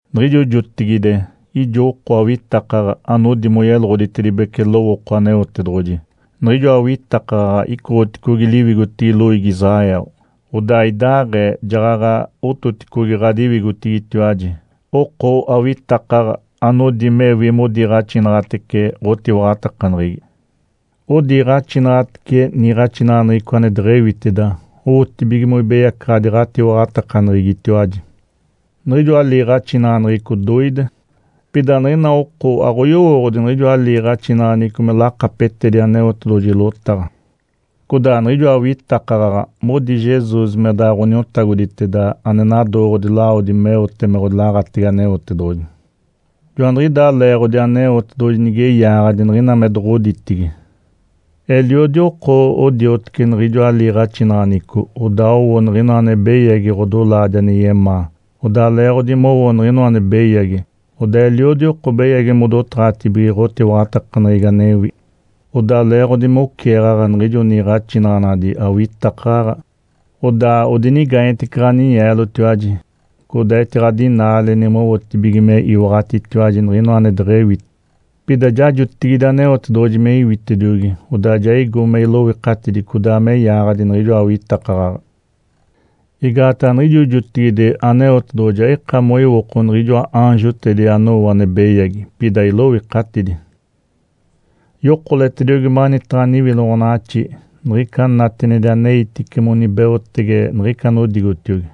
Niɡ̶ijo jotigide ijo oko awitakaɡ̶a anodi moyeloɡ̶oditedibece lowooko Aneotedoɡ̶oji. Niɡ̶ijoa awitakaɡ̶aɡ̶a icotiogi liwigotigi loiigi Israel. Odaa idaaɡ̶ee jaɡ̶aɡ̶a ototicogi ɡ̶adiwigotigitiwaji oko awitakaɡ̶a anodi mewi modiiɡ̶axinaɡ̶atece ɡ̶otiwaɡ̶atakaneɡ̶egi. Odiiɡ̶axinaɡ̶atece niiɡ̶axinaɡ̶aneɡ̶eco ane deɡ̶ewiteda owotibige moibeyacaɡ̶adi ɡ̶atiwaɡ̶atakaneɡ̶egitiwaji. Niɡ̶ijoa liiɡ̶axinaɡ̶aneɡ̶eco doide. Pida niɡ̶ina oko aɡ̶oyowooɡ̶odi niɡ̶ijoa liiɡ̶axinaɡ̶aneɡ̶eco me lakapetedi Aneotedoɡ̶oji lotaɡ̶a. Codaa niɡ̶ijoa awitakaɡ̶aɡ̶a modi Jesus me daɡ̶a Ǥoniotagoditeda ane nadooɡ̶odi lawodi meote me ɡ̶odilaɡ̶atege Aneotedoɡ̶oji. Joaniɡ̶idaa leeɡ̶odi Aneotedoɡ̶oji nige yaaɡ̶adi niɡ̶ina me doɡ̶oditigi. Eliodi oko odioteci niɡ̶ijoa liiɡ̶axinaɡ̶aneɡ̶eco, odaa owo niɡ̶inoa ane beyagi ɡ̶odolaadi ane yemaa. Odaa leeɡ̶odi mowo niɡ̶inoa ane beyagi, odaa eliodi oko beyagi modotaɡ̶atibige ɡ̶otiwaɡ̶atakaneɡ̶egi anewi. Odaa leeɡ̶odi me oceeɡ̶aɡ̶a niɡ̶ijo niiɡ̶axinaɡ̶anadi awitakaɡ̶a, odaa odinigaanyetece ɡ̶aninyeelotiwaji, codaa etiɡ̶adinaaleni mowotibige me iwaɡ̶atitiwaji niɡ̶inoa ane deɡ̶ewi. Pida ja jotigide Aneotedoɡ̶oji me iwitediogi, odaa ja igo me iloikatidi, codaa me yaaɡ̶adi niɡ̶ijoa awitakaɡ̶aɡ̶a. Igaataɡ̶a niɡ̶ijo jotigide Aneotedoɡ̶oji aika moiwoko niɡ̶ijoa aanjotedi anowo ane beyagi, pida iloikatidi. Yokoletediogi manitaɡ̶a niwiloɡ̶onaɡ̶axi niɡ̶ica natinedi aneitice monibeotege niɡ̶ica anodigotiogi.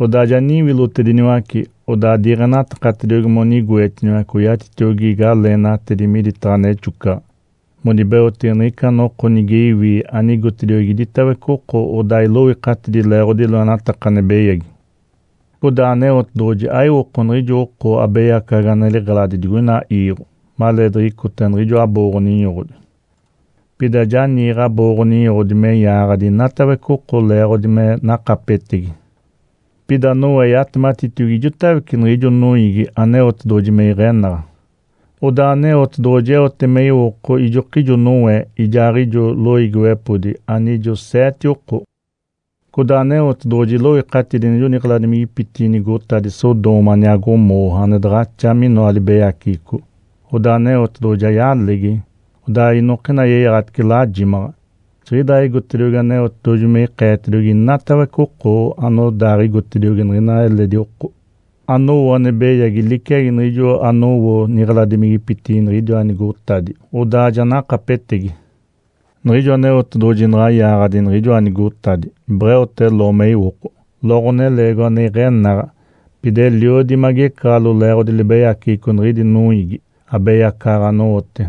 Odaa ja niwilotediniwace, odaa diiɡ̶enatakatediogi monigoetiniwace oyatitiogi galeenatedi miditaɡ̶a nexocaɡ̶a monibeotege niɡ̶ica noko nige iwi anigotediogi iditawece oko odaa iloikatidi leeɡ̶odi loenataka ane beyagi. Codaa Aneotedoɡ̶oji aiwoko niɡ̶ijo oko abeyacaɡ̶aɡ̶a ane liɡ̶eladi digoina iiɡ̶o maleediɡ̶icota niɡ̶ijo abooɡ̶o-ninyoɡ̶odi. Pida ja niiɡ̶e abooɡ̶o-ninyoɡ̶odi me yaaɡ̶adi inatawece oko leeɡ̶odi me nakapetegi. Pida Noé yatematitiogi ijotawece niɡ̶ijo noiigi Aneotedoɡ̶oji me iɡ̶enaɡ̶a, odaa Aneotedoɡ̶oji eote me iwoko ijokijo Noé ijaaɡ̶ijo loiigiwepodi anijo seete oko. Codaa Aneotedoɡ̶oji iloikatidi niɡ̶ijo niɡ̶eladimigipitigi nigotadi Sodoma aniaa Gomorra, ane daɡ̶axa minoa libeyaceɡ̶eco. Odaa Aneotedoɡ̶oji ja yalegi, odaa inoka yeyaɡ̶atice lajimaɡ̶a. Jiɡ̶idaaɡ̶igotediogi Aneotedoɡ̶oji me ikeetediogi inatawece oko anodaaɡ̶igotediogi niɡ̶ina eledi oko anowo ane beyagi liciagi niɡ̶ijo anowo niɡ̶eladimigipitigi niɡ̶idiwa nigotadi, odaa ja nakapetegi. Niɡ̶ijo Aneotedoɡ̶oji naɡ̶a yaaɡ̶adi niɡ̶ijoa nigotadi, beɡ̶eote Ló me iwoko. Ló ɡ̶oneleegiwa ane iɡ̶enaɡ̶a, pida eliodi magecaɡ̶alo leeɡ̶odi libeyaceɡ̶eco niɡ̶idi noiigi abeyacaɡ̶aɡ̶a anowote.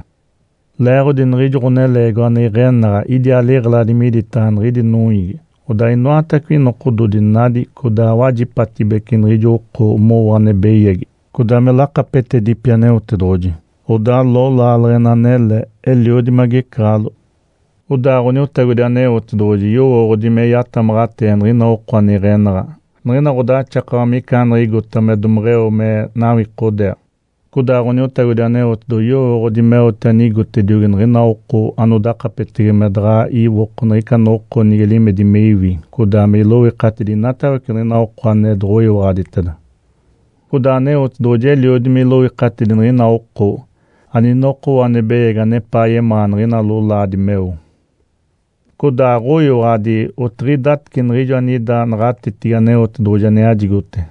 Leeɡ̶odi niɡ̶ijo ɡ̶oneleegiwa ane iɡ̶enaɡ̶a idiaa liɡ̶eladi miditaɡ̶a niɡ̶idi noiigi, odaa inoatawece nokododi nadi codaa wajipatibece niɡ̶ijo oko mowo ane beyagi codaa me lakapetedipi Aneotedoɡ̶oji. Odaa Ló laaleɡ̶ena anele eliodi magecaɡ̶alo. Odaa Ǥoniotagodi Aneotedoɡ̶oji yowooɡ̶odi me yatamaɡ̶atee niɡ̶ina oko ane iɡ̶enaɡ̶a niɡ̶ina ɡ̶odaxakawa micaaniɡ̶igota me domeɡ̶eo me nawikodeeɡ̶a. Codaa Ǥoniotagodi Aneotedoɡ̶oji yowooɡ̶odi meote anigotediogi niɡ̶ina oko anodakapetege me daɡ̶a iwoko niɡ̶ica noko nige limedi me iwi codaa me iloikatidi inatawece niɡ̶ina oko ane doɡ̶oyiwaɡ̶aditeda. Codaa Aneotedoɡ̶oji eliodi me iloikatidi niɡ̶ina oko aninokowo ane beyagi anepaa yemaa niɡ̶ina lolaadi meo, codaa aɡ̶oyiwaɡ̶adi otaaɡ̶idaatece niɡ̶ijo anida naɡ̶atetigi Aneotedoɡ̶oji ane yajigote.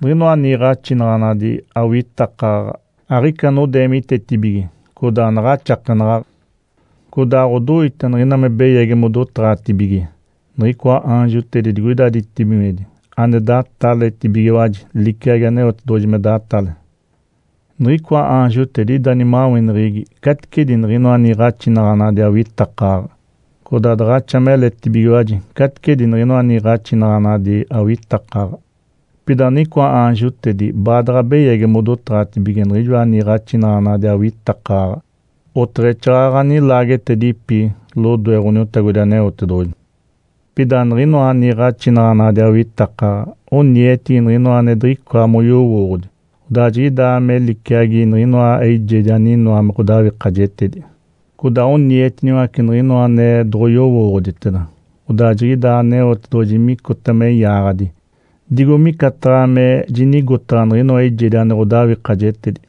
Niɡ̶inoa niiɡ̶axinaɡ̶anadi awitakaɡ̶a aɡ̶ica anodeemitetibige codaa anaɡ̶axakenaɡ̶aɡ̶a. Codaa aɡ̶odoita niɡ̶ina me beyagi modotaɡ̶atibige niɡ̶icoa aanjotedi digoida ditibigimedi ane dataletibigiwaji liciagi Aneotedoɡ̶oji me datale. Niɡ̶icoa aanjotedi ida nimaweneɡ̶egi caticedi niɡ̶inoa niiɡ̶axinaɡ̶anadi awitakaɡ̶a, codaa daɡ̶axa meletibigiwaji caticedi niɡ̶inoa niiɡ̶axinaɡ̶anadi awitakaɡ̶a. Pida niɡ̶icoa aanjotedi baadaɡ̶a beyagi modotaɡ̶atibige niɡ̶inoa niiɡ̶axinaɡ̶anadi awitakaɡ̶a oteɡ̶exaaɡ̶aɡ̶a nilaagetedipi lodoe Ǥoniotagodi Aneotedoɡ̶oji. Pida niɡ̶inoa niiɡ̶axinaɡ̶anadi awitakaɡ̶a onietigi niɡ̶inoa ane diɡ̶icoa moyowooɡ̶odi. Odaa jiɡ̶idaa me liciagi niɡ̶inoa eijedi aninoa me ɡ̶odawikajetedi. Codaa onietiniwace niɡ̶inoa ane doɡ̶oyowooɡ̶oditeda, odaa jiɡ̶idaa Aneotedoɡ̶oji micota me yaaɡ̶adi digo micataɡ̶a me jinigotaɡ̶a niɡ̶inoa eijedi ane ɡ̶odawikajetedi.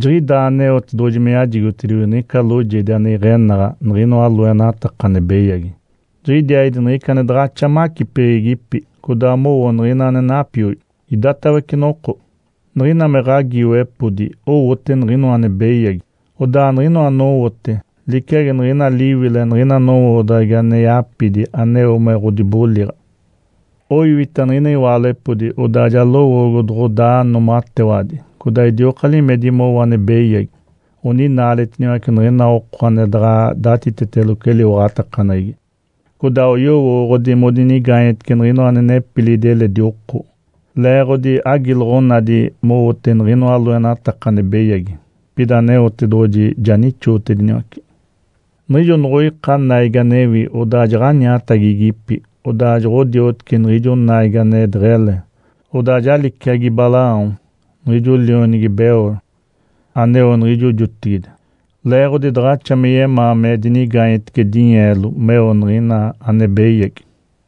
Jiɡ̶idaa Aneotedoɡ̶oji me yajigotediogi niɡ̶ica loojedi ane iɡ̶enaɡ̶a niɡ̶inoa loenataka ane beyagi. Jiɡ̶idiaaɡ̶idi niɡ̶ica ane daɡ̶axa macipeɡ̶egipi, codaa mowo niɡ̶ina ane napioi idatawece noko. Niɡ̶ina me ɡ̶agiiwepodi owote niɡ̶inoa ane beyagi, odaa niɡ̶inoa anowote liciagi niɡ̶ina liwile niɡ̶ina nowoodaɡ̶agi ane yapidi aneo me ɡ̶odiboliɡ̶a. Oiwita niɡ̶ina iwaalepodi, odaa ja lowoogo doɡ̶odaa noomatewadi, codaa idioka limedi mowo ane beyagi. Oninaaletiniwace niɡ̶ina oko ane daɡ̶a datiteteloco eliwaɡ̶atakaneɡ̶egi, codaa oyowooɡ̶odi modinigaanyetece niɡ̶inoa ane nepilidi eledi oko, leeɡ̶odi agiloɡ̶onadi mowote niɡ̶ijoa loenataka ane beyagi. Pida Aneotedoɡ̶oji ja nixootediniwace. Niɡ̶ijo noɡ̶oika naigi anewi, odaa jaɡ̶aniatagigipi. Odaa joɡ̶odioteci niɡ̶ijo naigi ane deɡ̶ele, odaa ja liciagi Balaão, niɡ̶ijo lionigi Beor, aneo niɡ̶ijo jotigide, leeɡ̶odi daɡ̶axa me yemaa me dinigaanyetece dinyeelo meo niɡ̶ina ane beyagi.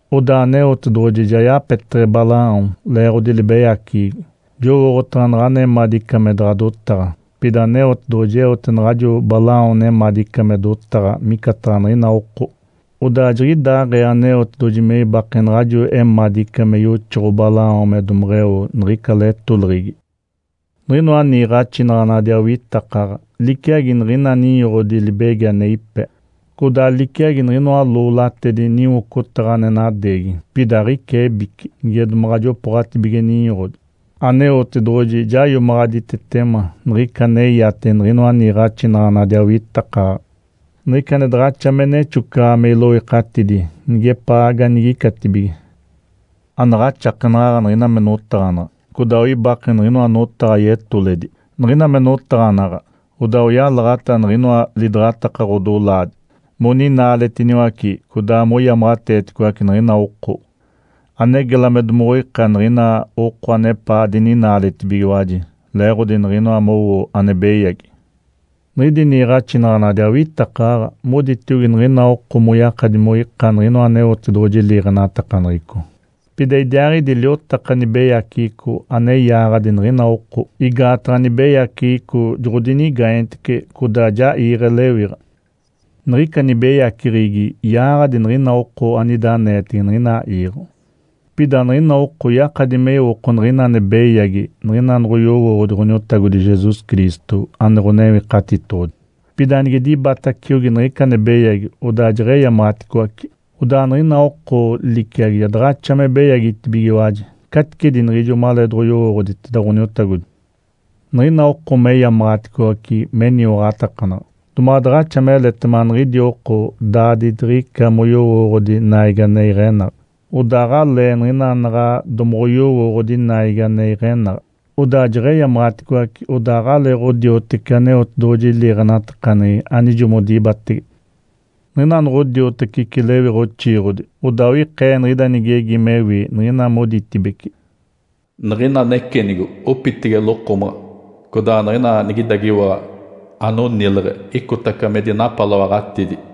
Odaa Aneotedoɡ̶oji ja yapeteɡ̶e Balaão leeɡ̶odi libeyaceɡ̶egi. Jowooɡ̶otaɡ̶a naɡ̶ana emadica me daɡ̶a dotaɡ̶a. Pida Aneotedoɡ̶oji eote naɡ̶ajo Balaão nemadica me dotaɡ̶a micataɡ̶a niɡ̶ina oko, odaa jiɡ̶idaaɡ̶ee Aneotedoɡ̶oji me ibake naɡ̶ajo emadica me yoxoɡ̶o Balaão me domeɡ̶eo niɡ̶ica letoleɡ̶egi. Niɡ̶inoa niiɡ̶axinaɡ̶anadi awitakaɡ̶a liciagi niɡ̶ina ninyoɡ̶odi libegi ane ipe, codaa liciagi niɡ̶inoa loolatedi niwocotaɡ̶a ane nadeegi, pida aɡ̶ica ebici niɡ̶ina me domaɡ̶a jopooɡ̶atibige ninyoɡ̶odi. Aneotedoɡ̶oji ja iomaɡ̶aditetema niɡ̶ica aneyate niɡ̶inoa niiɡ̶axinaɡ̶anadi awitakaɡ̶a niɡ̶ica ane daɡ̶axa me nexocaɡ̶a me iloikatidi nigepaa ganigicatibige. Anaɡ̶axakenaɡ̶aɡ̶a niɡ̶ina me notaɡ̶anaɡ̶a, codaa oibake niɡ̶inoa notaɡ̶a yetoledi. Niɡ̶ina me notaɡ̶anaɡ̶a, odaa oyalaɡ̶ata niɡ̶inoa lidaɡ̶ataka ɡ̶odolaadi moninaaletiniwace codaa moyamaɡ̶ateeticoace niɡ̶ina oko ane gela me domoɡ̶oika niɡ̶ina oko anepaa dininaaletibigiwaji leeɡ̶odi niɡ̶ina mowo ane beyagi. Niɡ̶idi niiɡ̶axinaɡ̶anadi awitakaɡ̶aɡ̶a moditiogi niɡ̶ina oko moyakadi moika niɡ̶inoa Aneotedoɡ̶oji liiɡ̶enatakaneɡ̶eco. Pida idiaaɡ̶idi liotaka nibeyaceɡ̶eco ane yaaɡ̶adi niɡ̶ina oko, igaataɡ̶a nibeyaceɡ̶eco joɡ̶odinigaanyetece codaa ja iiɡ̶e lewiɡ̶a. Niɡ̶ica nibeyaceɡ̶egi yaaɡ̶adi niɡ̶ina oko anida aneetege niɡ̶ina iiɡ̶o. Pida niɡ̶ina oko yakadi me iwoko niɡ̶ina ane beyagi niɡ̶ina nigoyowooɡ̶odi Ǥoniotagodi Jesus Cristo, ane Ǥonewikatitoɡ̶odi. Pida nige dibataciogi niɡ̶ica ane beyagi, odaa nigeyamaɡ̶aticoace, odaa niɡ̶ina oko liciagi ja daɡ̶axa me beyagitibigiwaji caticedi niɡ̶ijo maleedoɡ̶oyowooɡ̶oditeda Ǥoniotagodi. Niɡ̶ina oko meyamaɡ̶aticoace meniwaɡ̶atakanaɡ̶a, domaɡ̶a daɡ̶axa meletema niɡ̶idi oko daaditiɡ̶ica moyowooɡ̶odi naigi ane iɡ̶enaɡ̶a, odaa aɡ̶ele niɡ̶ina naɡ̶a domoɡ̶oyowoogodi naigi ane iɡ̶enaɡ̶a, odaa jeɡ̶eyamaɡ̶aticoace odaa aɡ̶aleeɡ̶odiotece Aneotedoɡ̶oji liiɡ̶enatakaneɡ̶egi anijo modibatege. Niɡ̶ina noɡ̶odiotaceci lewiɡ̶a oxiiɡ̶odi, odaa oikee niɡ̶ida nigegi mewi, niɡ̶ina moditibece, “Niɡ̶ina necenigo opitege lokomaɡ̶a, codaa niɡ̶ina nigidagiwaɡ̶a anonileɡ̶e icotaca me dinapaloaɡ̶atidi.”